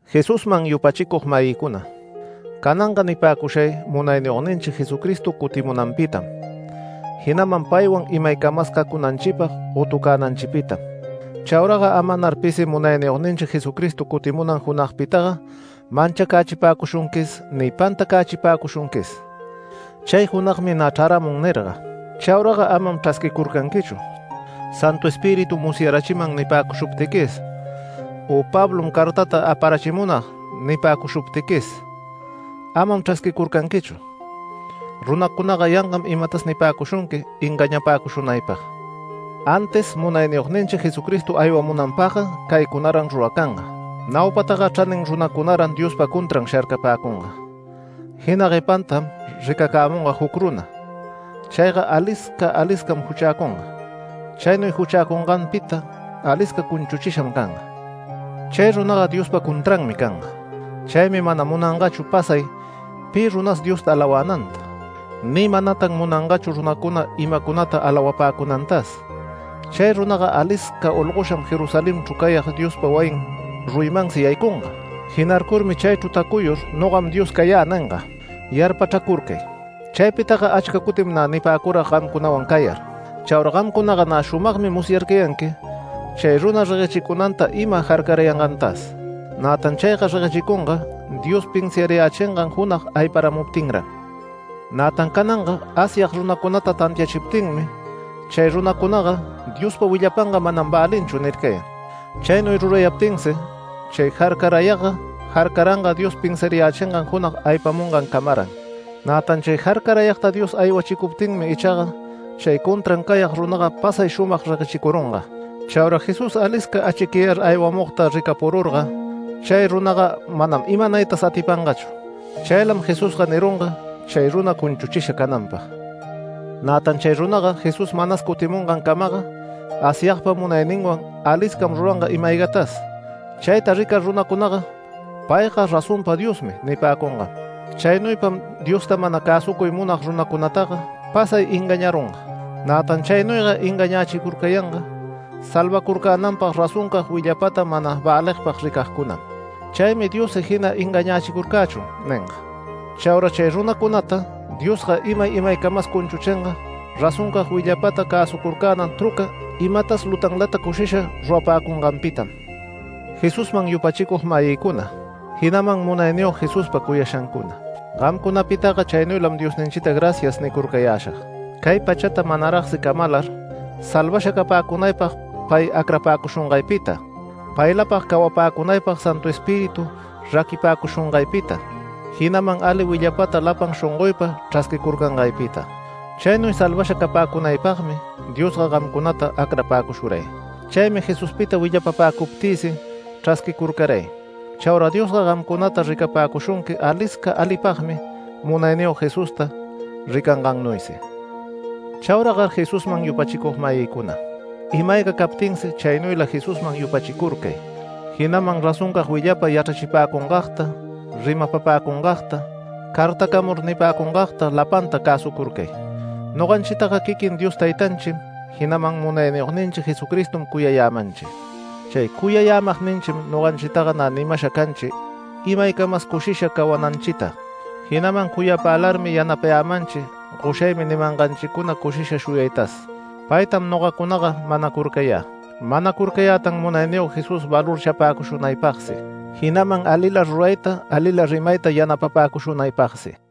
Jesusman yupachicug-mayïcuna, cananga nipäcushay Munayniyogninchi Jesucristo cutimunanpitam, jinaman paywan imaycamas cacunanchipag gotucänanchipitam. Chauraga amanar pisi Munayniyogninchi Jesucristo cutimunan junagpitaga manchacachipäcushunquis ni pantacächipäcushunquis “Chay junagmi nä chraramun” nirga. Chauraga amam chrasquicurcanquichu “Santu Espiritum musyarachiman” nipäcushuptiquis, u “Pablom cartata aparachimunag” nipäcushuptiquis, amam chrasquicurcanquichu. Runacunaga yangam imatas nipäcushunqui engañapäcushunaypag. Antis Munayniyogninchi Jesucristo aywamunanpagga caycunaran ruracanga; naupataga chranin runacunaran Diospa contran sharcapäcunga, jina guepantam ricacämunga juc runa. Chayga alisca aliscam juchäcunga. Chaynuy juchäcunganpita alisca cunchuchisham canga. Chay runaga Diospa contranmi canga. Chaymi mana munangachu pasay pi runas Diosta alawänanta, ni manatan munangachu runacuna imacunata alawapäcunantas. Chay runaga alisca olgosham Jerusalenchru cayag Diospa wayin ruyimansi yaycunga. Jinarcurmi chaychru tacuyur “Nogam Dios cayä” ninga. Yarpachracurcay, chaypitaga achca cutim nä nipäcurag gamcunawan cayar. Chaura gamcunaga nä shumagmi musyarcayanqui chay runa reguechicunanta ima jarcarayangantas. Nätan chayga reguechicunga Dios pinsiarayächingan junag ayparamuptinran. Nätan cananga Asyag runacunata tantiachiptinmi chay runacunaga “Diospa willapanga manam välinchu” nircayan. Chaynuy rurayaptinsi chay jarcarayagga jarcaranga Dios pinsiarayächingan junag aypamungancamaran. Nätan chay jarcarayagta Dios aywachicuptinmi ichaga chay contran cayag runaga pasay shumag reguechicurunga. Chaura Jesús alisca achicyayar aywamugta ricapururga chay runaga manam imanaytas atipangachu. Chaylam Jesusga nirunga chay runa cunchuchisha cananpag. Nätan chay runaga Jesús manas cutimungancamaga Asyagpa munayninwan, aliscam ruranga ima-aygatas. Chayta ricar runacunaga “¡Payga razonpa Diosmi!” nipäcungam. Chaynuypam Diosta mana cäsucuy munag runacunataga pasay engañarunga. Nätan chaynuyga engañächicurcayanga salvacurcänanpag razoncag willapata mana väligpag ricagcunam. Chaymi Diossi “Jina engañächicurcächun” ninga. Chaura chay runacunata Diosga imay imaycamas cunchuchinga razoncag willapata cäsucurcänan truca imatas lutanlata cushisha rurapäcunganpitam. Jesusman yupachicug-mayïcuna, jinaman Munayniyog Jesuspa cuyashancuna, gamcunapitaga chaynuylam Diosninchita “Gracias” nicurcayäshag, cay pachata manaragsi camalar salvasha capäcunaypag pay acrapäcushungaypita, paylapag cawapäcunaypag Santu Espíritu raquipäcushungaypita, jinaman ali willapata lapan shongoypa chrasquicurcangaypita. Chaynuy salvasha capäcunaypagmi Diosga gamcunata acrapäcushuray. Chaymi Jesuspita willapapäcuptïsi chrasquicurcaray. Chaura Diosga gamcunata ricapäcushunqui alisca alipagmi Munayniyog Jesusta ricangannuysi. Chauragar Jesusman yupachicug-mayïcuna, ima-ayga captinsi chaynuyla Jesusman yupachicurcay, jinaman razoncag willapa yachrachipäcungagta, rimapapäcungagta, cartacamur nipäcungagta lapanta cäsucurcay. Noganchitaga quiquin Dios Taytanchim, jinaman Munayniyogninchi Jesucristom cuyayämanchi. Chay cuyayämagninchim noganchitaga nä nimasha canchi imaycamas cushisha cawananchita, jinaman cuyapälarmi yanapayämanchi “Goshaymi” nimanganchicuna cushisha shuyaytas. Paytam nogacunaga manacurcayä. Manacurcayätan Munayniyog Jesús valorchapäcushunaypagsi, jinaman alila rurayta, alila rimayta yanapapäcunaypagsi.